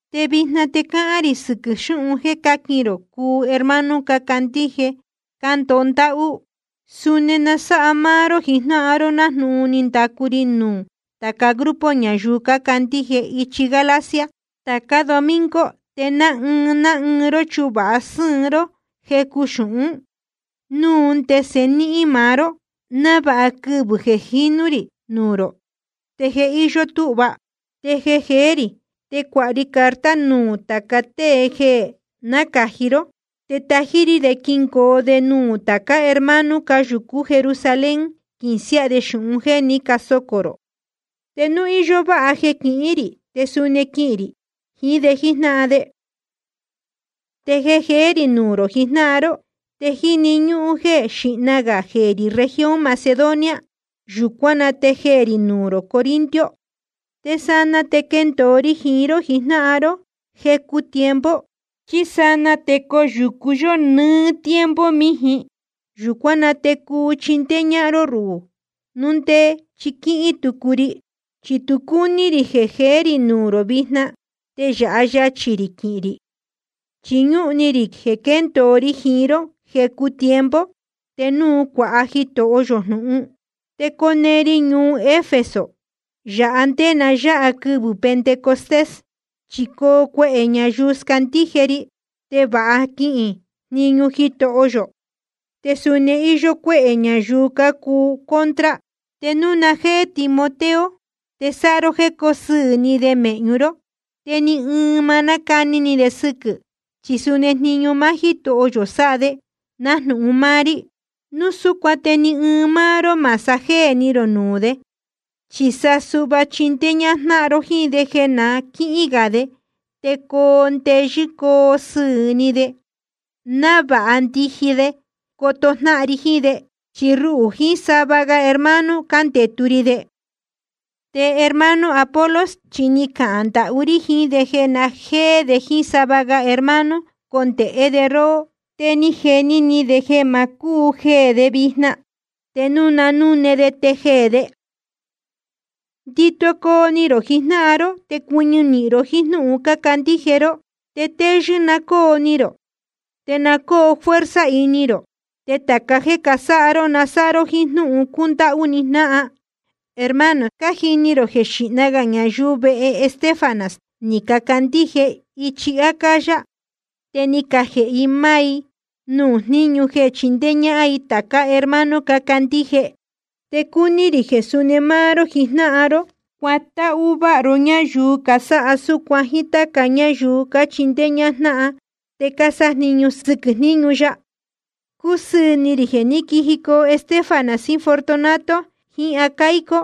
Te vijna te cahān rī sɨquɨ̄ xūhun jéē cáquin rō cuu hermano cácandíje cándoho ndáhú. Suni na sáha máá ró jijnáhan ró nájnūhun ni ndacu ri nuū tāca grupo ñayuu cácandíje ichi Galacia. Tācá domingo te ná ɨɨn ná ɨɨn ró chuvāha sɨ́ɨn ró jecu xūhún, núu ndese ni nihīn maá ró, návāha quɨvɨ̄ jeē jinú rī nuū rō te je íyó túhva. Te jeē jeé rī, te cuāha ri carta nuū tāca tée jeē nácāji ró, te tají rí de quingoo de nuū tācá hermano cáyūcú Jerusalén, quīsiáha de xūhun jéē ní casocō rō. Te núu íyó váha jeē quihín rī, te suni quihīn rī jiín de jíjnáhan de. Te jeē jeé rī nuū rō jijnáhan ró, te jíni ñúhún jeē xíhna gā jeē rī región Macedonia, yūcuán na te jeē rī ñuu rō Corinto. Te sanaa te quendōo ri jiín ró jijnáhan ró jecu tiempo, chí sanaa te coyūcu yó nɨɨ́ tiempo mījin. Yūcuán na te cuu chindéé ñáhán ró ruhū, núu ndé chi quíhín tucu ri. Chi tu cúní rī jeē rī nuū rō vijna te yāha yachī rī quihīn rī, chi ñúhun ni rī jeē quendōo ri jiín ró jecu tiempo, te núu cuāha Jitoho yō jnūhun. Te cone ri ñuu Efeso yāhá nde na yáha quɨvɨ̄ Pentecostés. Chi coo cuehē ñayuu scandíje ri, te vāha quihīn jniñu Jitoho yō. Te suni íyó cuéhē ñayuu cácuu contra. Te núu na jéé Timoteo, te sáha ró jéē coo sɨɨ̄ ni de mēhñu ró, te ni ɨɨn ma cáni ni de sɨquɨ̄. Chi suni jniñu máá Jítoho yō sáha de, nájnūhun máá rí. Núu súcuan te ni ɨɨn ró má sajéē ni rō nuū de. Chi sa suhva chindéé ñájnáhan ró jíín de jeē na quíhín gā de, te coo ndeyɨ́ coo sɨɨ̄ ni de, návāha ndiji de coto jnáhan ri jiín de. Chi ruhū jiín sava ga hermano cándetu ri de. Te hermano Apolos chi ni cahān ndahú rí jiín de jeē na jéé de jíín sava ga hermano, condēhé de róhó. Te ni jeni ni de jeē ma cúu jeē de vijna. Te núu na núne de te jeē de. Ndito coo ni rō jijnáhan ró, te cuɨñɨ nīhin ro jíín jnúhun cácandíje ró. Te téyɨ́ na cóo ni rō, te na cóo fuerza ini rō. Te tāca jéē casáha ró, na sáha ró jíín jnúhun cúndáhú ni jnáhan. Hermano, cájini rō jeē xíhna gā ñayuu vehe Estéfanas ni cacandíje ichi Acaya. Te ni cajēhe i máá i nuū jniñu jeē chindéé ñáhán i tācá hermano cácandíje. Te cúní rī jeē suni máá ró jijnáhan ró, cuatáhú váha ró ñáyuu casáha súcuan, jíín táca ñáyuu cachindéé ñájnáhan te cásájniñu sɨquɨ̄ jníñu ya. Cúsɨɨ̄ ni rī jeē ní quijicoo Estéfanas jiín Fortunato jiín Acaico,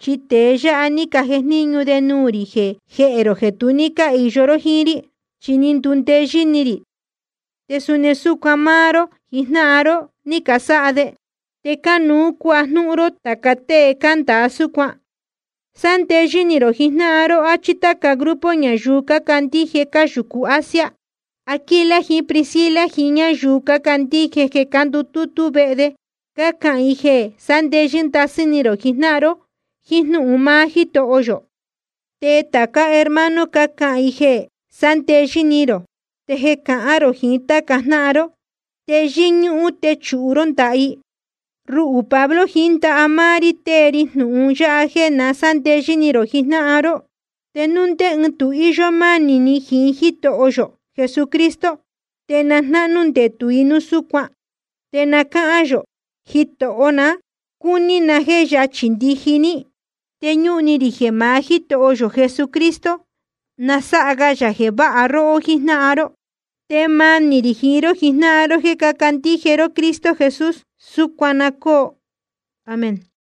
chi tēe yáha ni cajejníñu de nuū rī jehē rō jeē tu ní cáhīyo ró jíín rí. Chi ni ndundeyɨ́ ni rī, te suni súcuan máá ró jijnáhan ró, ni casáha de. Te cánuú cuajnúhún ró tāca tée cándāa súcuan. Sándeyɨ́ ni rō jijnáhan ró, áchí táca grupo ñayuu cácandíje cáyūcu Asia. Aquila jiín Priscila jiín ñáyuu cácandíje jeē cándutútú vehe de, cácahān i jeē sándeyɨ́ ndasɨ́ ni rō jiín jnúhun máá Jítoho yō. Te tācá hermano cácahān i jeē sándeyɨ́ ni rō. Te jeē cahán rō jiín táca jnáhan ró, te yɨ́ñúhún techūhu ró ndaha i. Ruhū Pablo, jiín ndaha máá rí tée ri jnūhun yáha jeē na sándeyɨ́ ni rō jijnáhan ró. Te núu ndé ɨɨn tu íyó mánī jiín Jítoho yō Jesucristo, te na jnáhnú ndetū i núu súcuan. Te na cáhán yō: Jitoho ná, cúní na jéē yachī ndiji ní. Te ñúhun ni rī jeē maá Jítoho yō Jesucristo na sáha ga yā jeē váha róhó jíjnáhan ró. Te manī rī jiín ró jijnáhan ró jéē cácandíje ró Cristo Jesús. Súcuan na cóo. Amén.